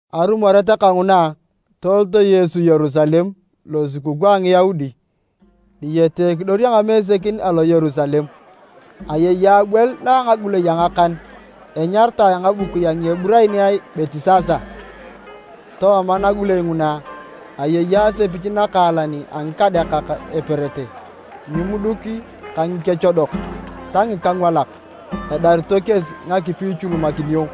Arumoret kanguna, tolot Yesu Yerusalem losukukuu a Ngiyaudi. Diyete ekidor a ngamesekin alo Yerusalem, ayei abwel na a ngagulei a ngakan. Enyaritae a ngabukui a Ngieburaniae Betisasa. Tooma nagulei nguna, ayei asepich nakaalan a ngikadeakak eperete, ngimuduk ka ngikechodok ta ngikangwalak. [Edarito kesi ngakipi ichulumakinio.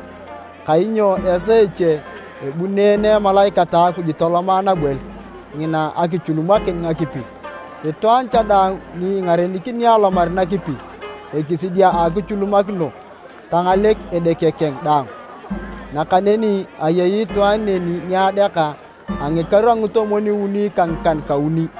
Kainyo esaa eche abuneene emalaikat a Akuj toloma nabwel ngina akichulumakin ngakipi. Itwaan cha daang ni engarenikini alomar nakipi ekisidi a akichulumakino, tangalek edeke keng daang.] Nakaneni ayei itwaan neni ni adeaka a ngikaru a ngitomwon-uni ka ngikan-kauni.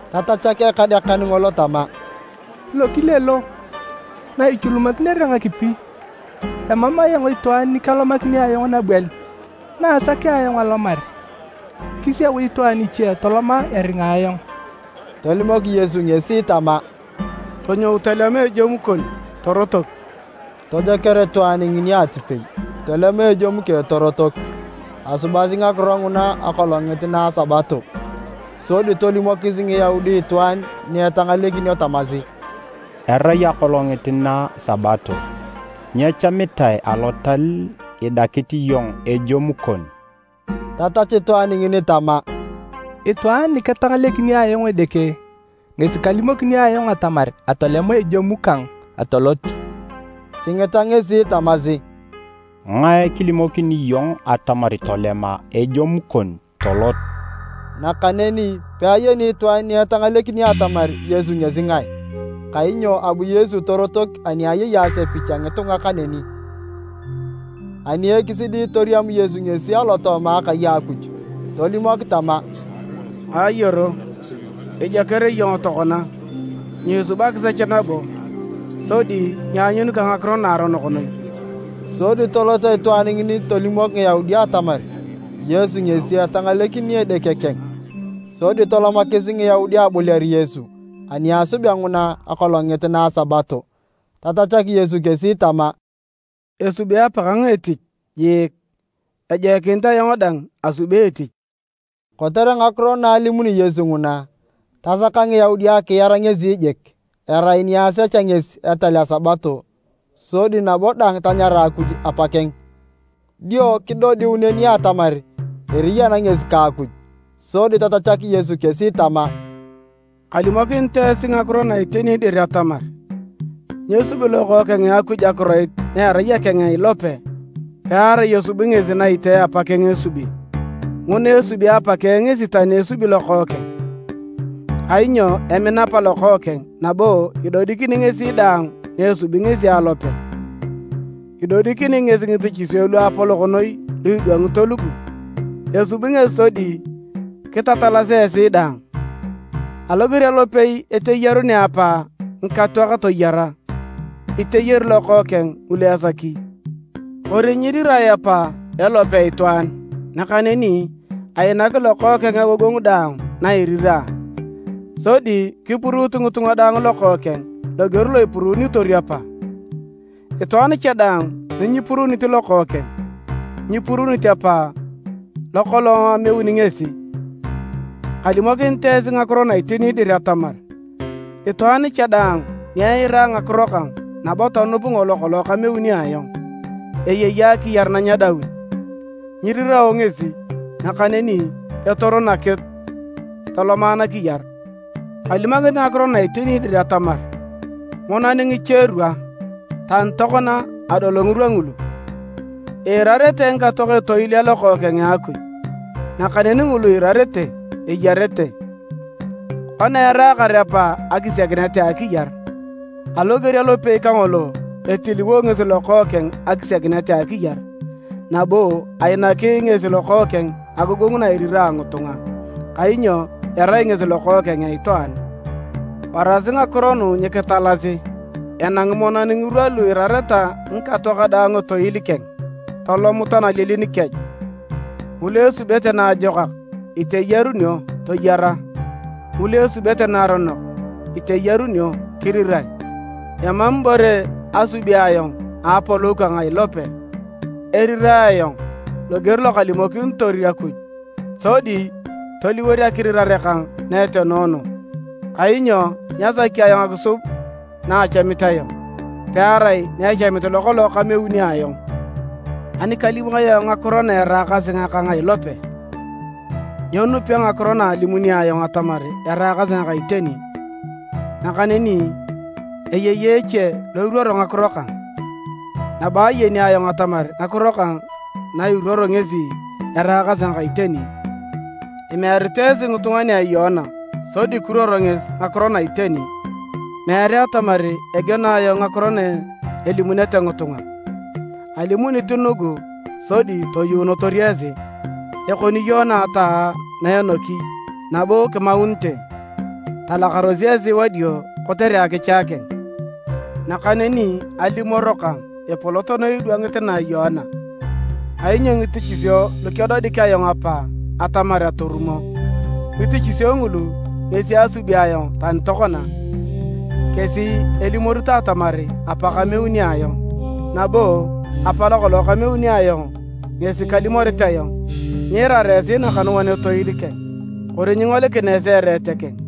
Tatachak ekadeakan ngolo tama, “Lokile lo, na ichulumakinere ngakipi, emam ayong itwaan ni kelomakini ayong nabwel, na asakea ayong alomar, kisiau itwaan iche toloma eringa ayong.” Tolimok Yesu ngesi tama, “Tonyou tolema ejemu kon, torotok.” Tojoker itwaan ngini atipei tolema ejemu keng torotok. Asubasi ngakiro nguna akolongit na a Sabato, sodi tolimokis Ngiyaudi itwaan ni etangalekinio tamasi, “Erai akolongit na Sabato, nyechamitae alotal idakit iyong ejemu kon.” Tatachu itwaan ngini tama, “Itwaan niketangalekini ayong edeke ngesi kalimokini ayong atamar atolema ejemu kang atolot.” Kingita ngesi tamasi, “Ngae kilimokini iyong atamar tolema ejemu kon tolot?” Nakaneni peayeni itwaan ni etangalekinio atamar Yesu ngesi ngae, kainyo abu Yesu torotok ani ayei asepich a ngitunga kaneni. Ani ekisidi, toriam Yesu ngesi alotooma akai a Akuj, tolimok tama, “Ayoro, ijoker iyong tokona. Nyiisub akisech nabo, sodi nyianyun ka ngakiro naaronok noi.” Sodi tolot itwaan ngini tolimok Ngiyaudi atamar Yesu ngesi etangalekini edeke keng. Sodi tolomakis Ngiyaudi aboliar Yesu ani asubea nguna akolongit na a Sabato. Tatachak Yesu kesi tama, “Esubi Apakang etich jiik, ejoikinit ayong dang asubi etich.” Kotere ngakiro na alimuni Yesu nguna, tasaka Ngiyaudi akiar ngesi jik. Erai ni asechea ngesi etal a Sabato sodi nabo dang tanyara Akuj Apakeng, dio kidodiu neni atamar eriyan ngesi ka Akuj. Sodi tatachak Yesu kesi tama, “Kalimokinit esi ngakiro na iteni dir atamar, nyesubi Lokookeng a Akuj akiroit na erai akeng a ilope pearai esubi ngesi na itee Apakeng esubi. Nguna esubi Apakeng ngesi tani esubi Lokookeng. Kainyo emina Apa Lokookeng nabo idodikini ngesi daang naesubi ngesi alope. Idodikini ngesi ngitichisio luapolok noi lu idwangito lugu. Esubi ngesi sodi kitatalasi esi daang. Aloger alopei iteyarunea Apa ngikatoak toyara, iteyari Lokookeng ngulu esaki. Kori nyirirae Apa elope itwaan, nakaneni ainaki Lokookeng agogongu daang na irira, sodi kipuruut ngitunga daang Lokookeng loger lo ipuruunitotor Apa. Itwaan cha daang ni nyipuruunit Lokookeng, nyipuruunit Apa lokolong ameuni ngesi. “Kalimokinit esi ngakiro na iteni dir atamar, itwaan cha daang ni eira ngakiro kang nabo tonup ngolo kolong kameuni ayong, eyei akiyar na nyedaun. Nyirirao ngesi, nakaneni etor nakitu toloma nakiyar. Kalimokinit ngakiro na iteni dir atamar, monan ngicherwa, tani tokona adol ngirwa ngulu, iirarete ngikatoak etoil a Lokookeng a Akuj, nakaneni ngulu iirarete, eyarete. Kona eraakar Apa akisiakinet a akiyar, aloger alopei kangolo, etiliwo ngesi Lokookeng akisiakinet a akiyar. Nabo ainaki ngesi Lokookeng agogongu na irira ngitunga, kainyo erai ngesi Lokookeng a Itwaan. Warasi ngakiro nugu nyikitalasi, enangi monan ngirwa lu iirareta ngikatoak daang etoil keng, tolomut analielin kech, ngulu esubete naajokak iteyarunio, toyara, ngulu esubete naaronok iteyarunio, kirirae. “Emam ibore asubi ayong a apolou kang a ilope. Erirae ayong loger lokalimokinitor Akuj, sodi toliwor akirirare kang na etenoono, kainyo nyasaki ayong akisub na achamit ayong, pearai naechamit lokolong kameuni ayong. “Ani kalim ayong ngakiro na eraakasi ngakang a ilope, nyenupio ngakiro na alimuni ayong atamar eraakasi ngaka iteni. Nakaneni eyei eche lo iruoro ngakiro kang, nabo ayeni ayong atamar ngakiro kang na iruoro ngesi eraakasi ngaka iteni. Imearito esi ngitunga nia Yoana sodi kiruoror ngesi ngakiro na iteni. Meere atamar egeno ayong ngakiro na elimunete ngitunga, alimunit nugu sodi toyuunotor esi. Ekoni Yoana ataa na enoki nabo kimaunite, talakaros esi wadio kotere akicha keng. Nakaneni alimoro kang epolot noi idwangit na a Yoana. Kainyo ngitichisio lukedodik ayong Apa atamar atorumo, ngitichisio ngulu ngesi asubi ayong tani tokona, kesi elimorito atamar Apa kameuni ayong. Nabo Apa lokolong kameuni ayong ngesi kalimorit ayong. Nyiirara esi nakanuan etoil keng, kori nyingolikina esi ereet keng.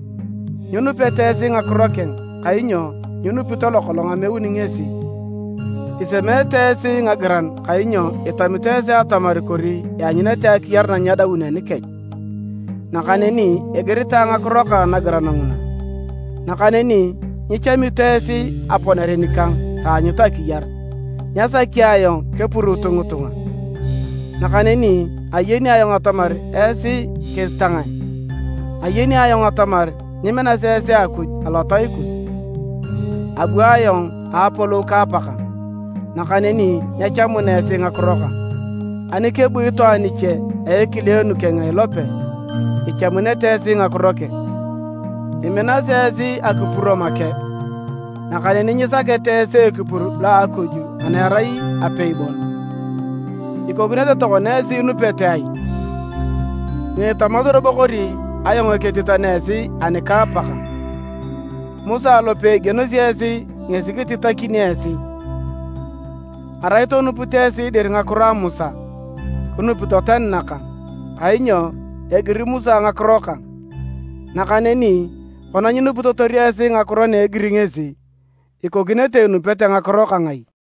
Nyinupete esi ngakiro keng kainyo nyinupito lokolong ameuni ngesi. Isemeete esi ngagiran kainyo itamito esi atamar kori ianyunete akiyar na nyedaun anikech, nakaneni igiritae ngakiro kang nagiran nguna! Nakaneni nyichamito esi aponere nikang taanyut akiyar. “Nyasaki ayong kepuruut ngitunga. Nakaneni ayeni ayong atamar esi kesi ta ngae. Ayeni ayong atamar nyiminasi esi Akuj alotai kus. Abu ayong a apolou ka Apakang, nakaneni nyechamuna esi ngakiro kang. Ani kebu itwaan iche a ekileenu keng a ilope, ichamunete esi ngakiro keng. Iminasi esi akipuro make, nakaneni nyisakete esi ekipur lo a Akuj ana erai apei bon, ikokinete tokona esi inupete ai? Nyiitamasi robo kori ayong ketitakini esi ani ka Apakang. Musa lopei igenosi esi ngesi kititakini esi. Arai tonupito esi dir ngakiro a Musa, kinupito tani nakang, kainyo egiri Musa ngakiro kang. Nakaneni kona nyinupitotor esi ngakiro na egiri ngesi, ikokinete inupete ngakiro kang ai?”